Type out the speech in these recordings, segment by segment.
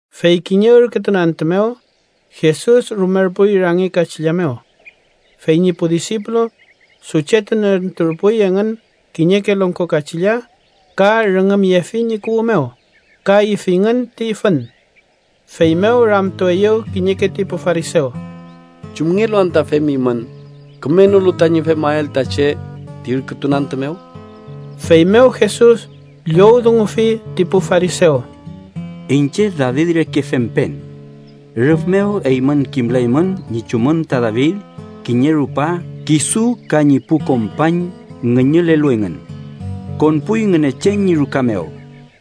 Fey kiñe ürkütun antü mew, Jesus rumerpuy rangi kachilla mew. Fey ñi pu disipulu suchetunenturpuy engün kiñeke longko kachilla ka rüngümyefi ñi kuwü mew ka ifingün ti fün. Feymew ramtueyew kiñeke ti pu farisew: —¿Chumngelu anta femimün kümenolu tañi femael ta che ti ürkütun antü mew? Feymew Jesus llowdungufi ti pu farisew: —Iñche David reke fempen. Rüf mew eymün kimlaymün ñi chumün ta David kiñe rupa kisu ka ñi pu kompañ ngüñülelu engün. Konpuy Ngünechen ñi ruka mew,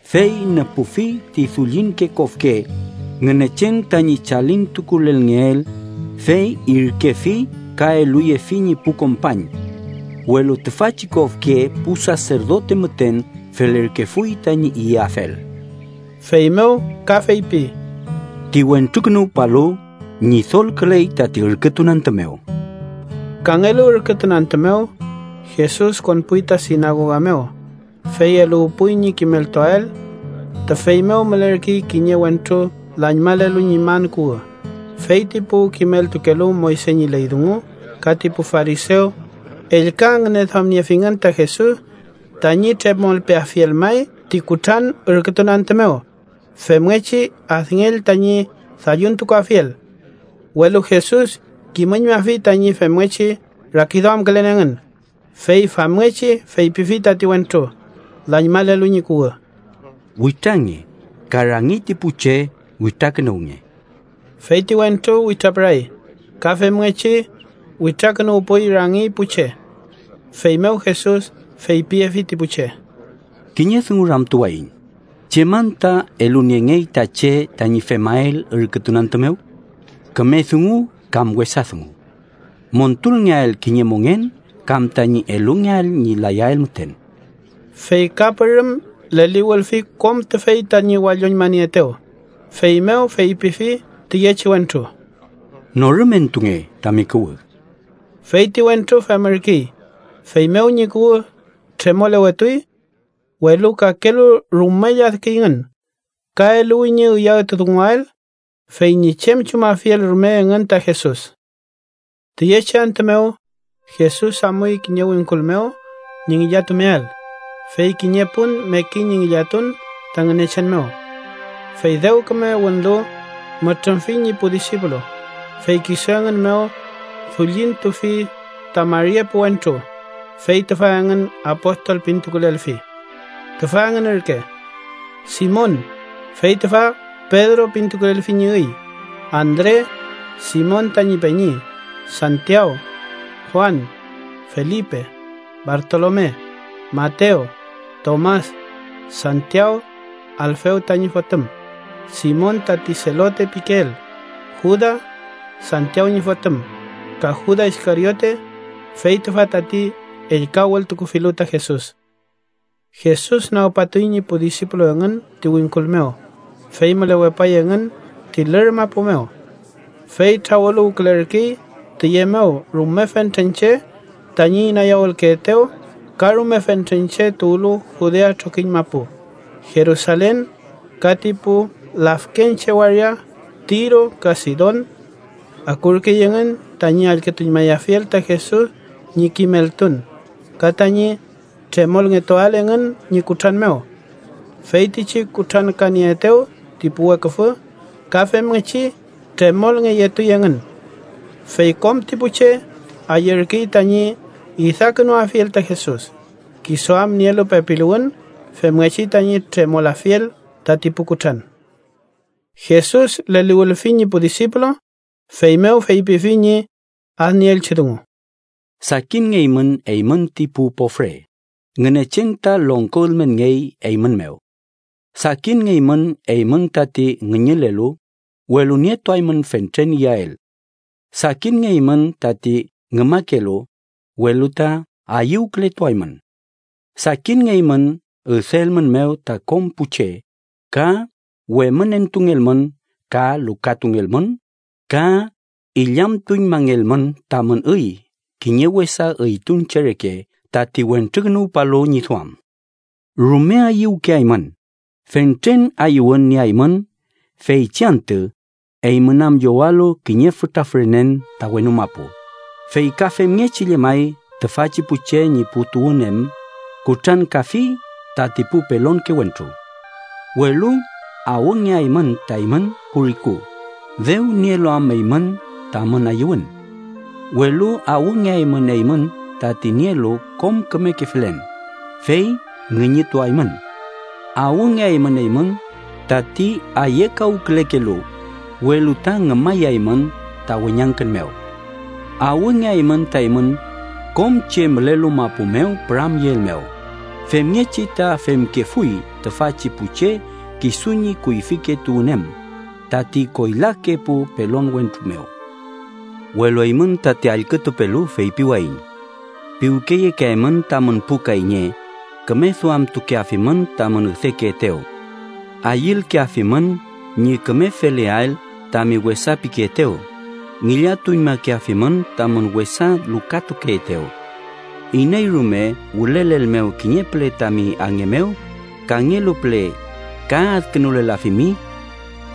fey nüpufi ti dullinke kofke Ngünechen tañi chalintukulelngeel, fey irkefi ka eluyefi ñi pu kompañ. Welu tüfachi kofke pu saserdote müten felerkefuy tañi iyafel. Feymew ka feypi: —Ti Wentrukünuwpalu Ñidolküley tati ürkütun antü mew. Kangelu ürkütun antü mew, Jesus konpuy ta sinagoga mew, fey eluwpuy ñi kimeltuael. Tüfey mew mülerkey kiñe wentru lañmalelu ñi man kuwü, fey ti pu kimeltukelu Moyse ñi ley dungu ka ti pu farisew ellka ngüneduamniefingün ta Jesus tañi tremolpeafiel may ti kutran ürkütun antü mew, femngechi adngell tañi dalluntukuafiel. Welu Jesus kimüñmafi tañi femngechi rakiduamkülen engün, fey famngechi feypifi tati wentru, lañmalelu ñi kuwü: —Witrange ka rangi ti pu che witrakünuwnge. Fey ti wentru witrapüray ka femngechi witrakünuwpuy rangi pu che. Feymew Jesus feypiyefi ti pu che: —Kiñe dungu ramtuwayiñ: ¿Chem anta eluniengey ta che tañi femael ürkütun antü mew? ¿Küme dungu kam wesa dungu? ¿Montulngeael kiñe mongen kam tañi elungeael ñi layael müten? Fey ka pürüm leliwülfi kom tüfey tañi walloñmanieetew, feymew feypifi tüyechi wentru: —Norümentunge tami kuwü. Fey ti wentru femürkey, feymew ñi kuwü tremolewetuy. Welu kakelu rume lladküyngün ka eluwi ñi üyawtudunguael fey ñi chem chumafiel rume engün ta Jesus. Tüyechi antü mew, Jesus amuy kiñe wingkul mew ñi ngillatumeael, fey kiñe pun mekey ñi ngillatun ta Ngünechen mew. Fey dew küme wünlu, mütrümfi ñi pu disipulu, fey kisu engün mew dullintufi ta mari epu wentru, fey tüfa engün apostol pintukulelfi. Tüfa engün ürke: Simon, fey tüfa Pedro pintukulelfi ñi üy; Andre, Simon tañi peñi; Santiaw, Juan, Felipe, Bartolome, Matew, Tomas, Santiaw, Alfew tañi fotüm; Simon tati Selote pikeel, Juda, Santiaw ñi fotüm; ka Juda Iskariote, fey tüfa tati ellka wültukufilu ta Jesus. Jesus nagpatuy ñi pu disipulu engün ti wingkul mew, fey mülewepay engün ti lür mapu mew. Fey trawüluwkülerkey tüye mew rume fentren che tañi inayawülkeetew ka rume fentren che tuwlu Judea trokiñ mapu, Jerusalen ka ti pu lafkenche waria Tiro ka Sidon. Akurkey engün tañi allkütuñmayafiel ta Jesus ñi kimeltun ka tañi tremolngetuael engün ñi kutran mew. Feytichi kutrankanieetew ti pu weküfü, ka femngechi tremolngeyetuy engün. Fey kom ti pu che ayürkey tañi idakünuafiel ta Jesus, kisu am nielu pepiluwün femngechi tañi tremolafiel tati pu kutran. Jesus leliwülfi ñi pu disipulu, feymew feypifi ñi adnieelchi dungu: “Sakinngeymün eymün ti pu pofre, Ngünechen ta longko ülmenngey eymün mew. Sakinngeymün eymün tati ngüñülelu, welu nietuaymün fentren iyael. Sakinngeymün tati ngümakelu, welu ta ayüwkületuaymün. Sakinngeymün üdeelmünmew ta kom pu che, ka wemünentungelmün, ka lukatungelmün ka illamtuñmangelmün tamün üy kiñe wesa üytun che reke, tat Wentrukünuwpalu ñi duam. Rume ayüwkeaymün, fentren ayüwün nieaymün feychi antü, eymün am llowalu kiñe fütra fürenen ta wenu mapu, fey ka femngechi llemay tüfachi pu che ñi pu tuwün em kutrankafi tati pu pelonke wentru. ¡Welu awngeaymün ta eymün pu riku, dew nielu am eymün tamün ayüwün! ¡Welu awngeaymün eymün tati nielu kom kümeke felen, fey ngüñütuaymün! ¡Awngeaymün eymün tati ayekawkülekelu, welu ta ngümayaymün ta weñangkün mew! ¡Awngeaymün ta eymün kom che mülelu mapu mew püramyeelmew, femngechi ta femkefuy tüfachi pu che kisu ñi kuyfike tuwün em, tati koylake pu pelon wentru mew! “Welu eymün tati allkütupelu, feypiwayiñ: Piwkeyekeaymün tamün pu kayñe, küme duamtukeafimün tamün üdekeetew. Ayülkeafimün ñi küme feleael tami wesa pikeetew, ngillatuñmakeafimün tamün wesa lukatukeetew. Iney rume wülelelmew kiñe püle tami ange mew, kangelu püle ka adkünulelafimi.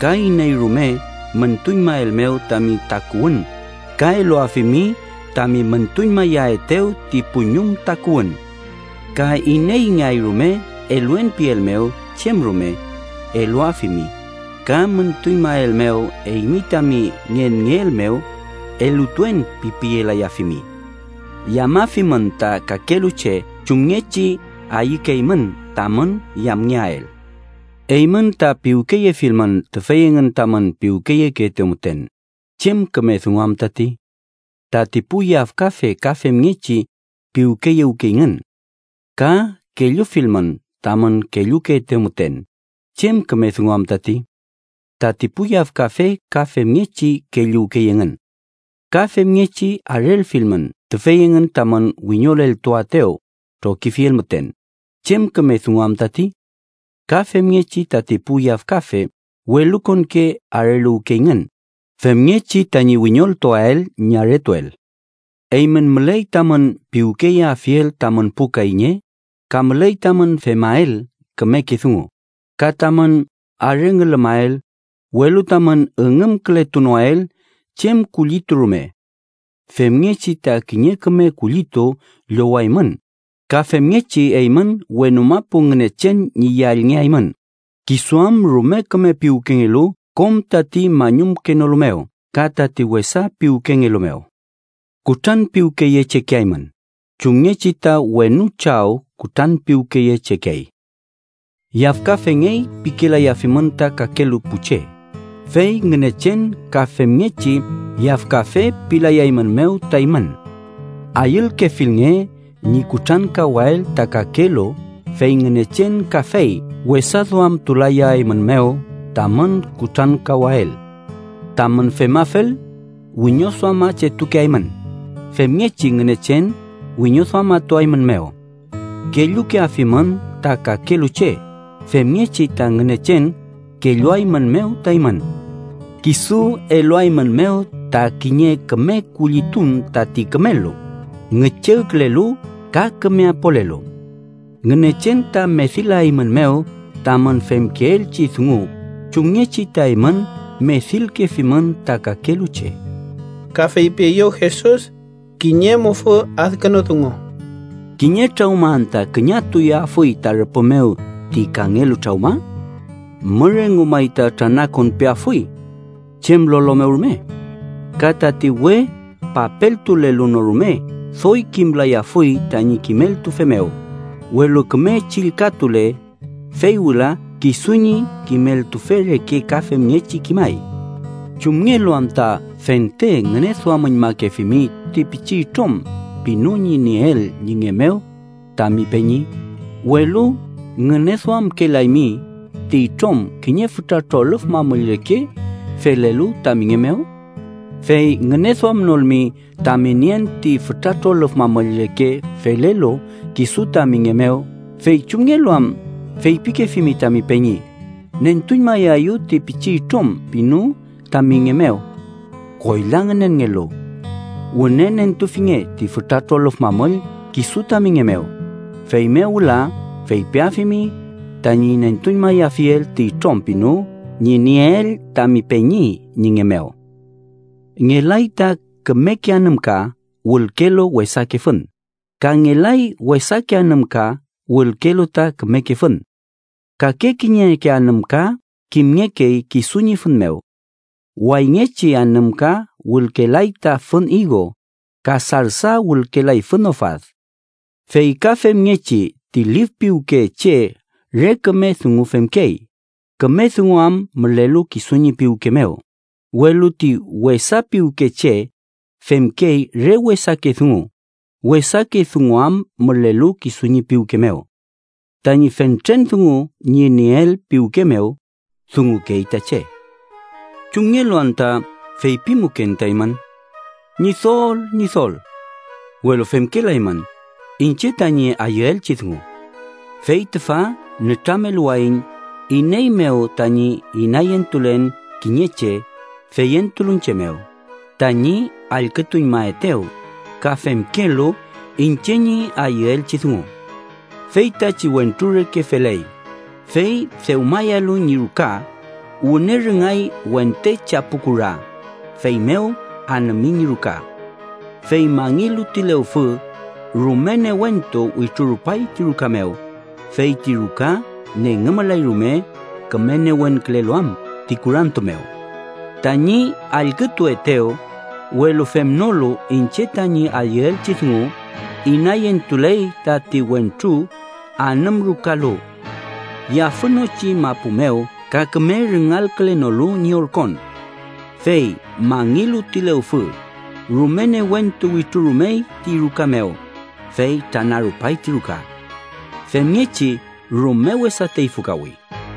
Ka iney rume müntuñmaelmew tami takuwün, ka eluafimi tami müntuñmayaetew ti puñum takuwün. Ka ineyngeay rume ‘eluen’ pielmew chem rume, eluafimi. Ka müntuñmaelmew eymi tami ngenngeel mew, ‘elutuen’ pipiyelayafimi. Yamafimün ta kakelu che chumngechi ayükeymün tamün yamngeael. “Eymün ta piwkeyefilmün tüfey engün tamün piwkeyekeetew müten, ¿chem küme dungu am tati? Tati pu yafkafe ka femngechi piwkeyewkeyngün. Ka kellufilmün tamün kellukeetew müten, ¿chem küme dungu am tati? Tati pu yafkafe ka femngechi kelluwkey engün. Ka femngechi arelfilmün tüfey engün tamün wiñoleltuaetew trokifiel müten, ¿chem küme dungu am tati? Ka femngechi tati pu yafkafe welukonke areluwkeyngün, femngechi tañi wiñoleltuael ñi aretuel. Eymün müley tamün piwkeyeafiel tamün pu kayñe, ka müley tamün femael kümeke dungu, ka tamün arengülümael, welu tamün üngümkületunoael chem kullitu rume. Femngechi ta kiñe küme kullitu llowaymün, ka femngechi eymün wenu mapu Ngünechen ñi yallngeaymün, kisu am rume küme piwkengelu kom tati mañumkenolu mew ka tati wesa piwkengelu mew. Kutranpiwkeyechekeaymün chumngechi ta wenu Chaw kutranpiwkeyechekey. “Yafkafengey pikelayafimün ta kakelu pu che, fey Ngünechen ka femngechi yafkafe pilayaeymünmew ta eymün. Ayülkefilnge ñi kutrankawael ta kakelu, fey Ngünechen kafey wesaduamtulayaeymünmew tamün kutrankawael. Tamün femafel, wiñoduamachetukeaymün femngechi Ngünechen wiñoduamatuaeymünmew. Kellukeafimün ta kakelu che femngechi ta Ngünechen kelluaeymünmew ta eymün. Kisu eluaeymünmew ta kiñe küme kullitun tati kümelu, ngüchegkülelu ka küme apolelu. Ngünechen ta medilaeymünmew tamün femkeelchi dungu chumngechi ta eymün medilkefimün ta kakelu che.” Ka feypieyew Jesus kiñe mufü adkünu dungu: “¿Kiñe trawma anta küñatuyeafuy ta rüpü mew ti kangelu trawma? ¿Mür engu may ta tranakonpeafuy chem lolo mew rume? Ka tati we papeltulelu no rume doy kimlayafuy tañi kimeltufe mew, welu küme chillkatule, fey wüla kisu ñi kimeltufe reke ka femngechi kimay. “¿Chumngelu anta fente ngüneduamüñmakefimi ti pichi itrom pinu ñi nieel ñi nge mew tami peñi, welu ngüneduamkelaymi ti itrom kiñe fütra trolüf mamüll reke felelu tami nge mew? Fey ngüneduamnolmi tami nien ti fütra trolüf mamüll reke felelu kisu tami nge mew, fey ¿chumngelu am feypikefimi tami peñi: ‘Nentuñmaeyu ti pichi itrom pinu tami nge mew?’ ¡Koyla ngünenngelu! Wüne nentufinge ti fütra trolüf mamüll kisu tami nge mew, feymew wüla feypiafimi tañi nentuñmayafiel ti itrom pinu ñi nieel tami peñi ñi nge mew. “Ngelay ta kümeke anümka wülkelu wesake fün, ka ngelay wesake anümka wülkelu ta kümeke fün. Kake kiñeke anümka kimngekey kisu ñi fün mew. Wayngechi anümka wülkelay ta fün igo, ka sarsa wülkelay fün ofad. Fey ka femngechi ti lif piwke che re küme dungu femkey, küme dungu am mülelu kisu ñi piwke mew, welu ti wesa piwke che femkey re wesake dungu, wesake dungu am mülelu kisu ñi piwke mew. Tañi fentren dungu ñi nieel piwke mew, dungukey ta che. “¿Chumngelu anta feypimuken ta eymün: ‘Ñidol, Ñidol’, welu femkelaymün iñche tañi ayüelchi dungu? Fey tüfa nütrameluwayiñ iney mew tañi inayentulen kiñe che feyentulu iñche mew, tañi allkütuñmaetew ka femkelu iñche ñi ayüelchi dungu: Feytachi wentru reke feley, fey dewmayalu ñi ruka, wüne rüngay wente chapu kura, feymew anümi ñi ruka. Fey mangilu ti lewfü, rume newentu wütrurupay ti ruka mew, fey ti ruka nengümlay rume küme newenkülelu am ti kurantu mew. Tañi allkütuetew, welu femnolu iñche tañi ayüelchi dungu inayentuley tati wentru anümrukalu yafünochi mapu mew ka küme rüngalkülenolu ñi orkon. Fey mangilu ti lewfü, rume newentu wütrurumey ti ruka mew, fey tranarupay ti ruka. Femngechi rume wesa teyfükawi.”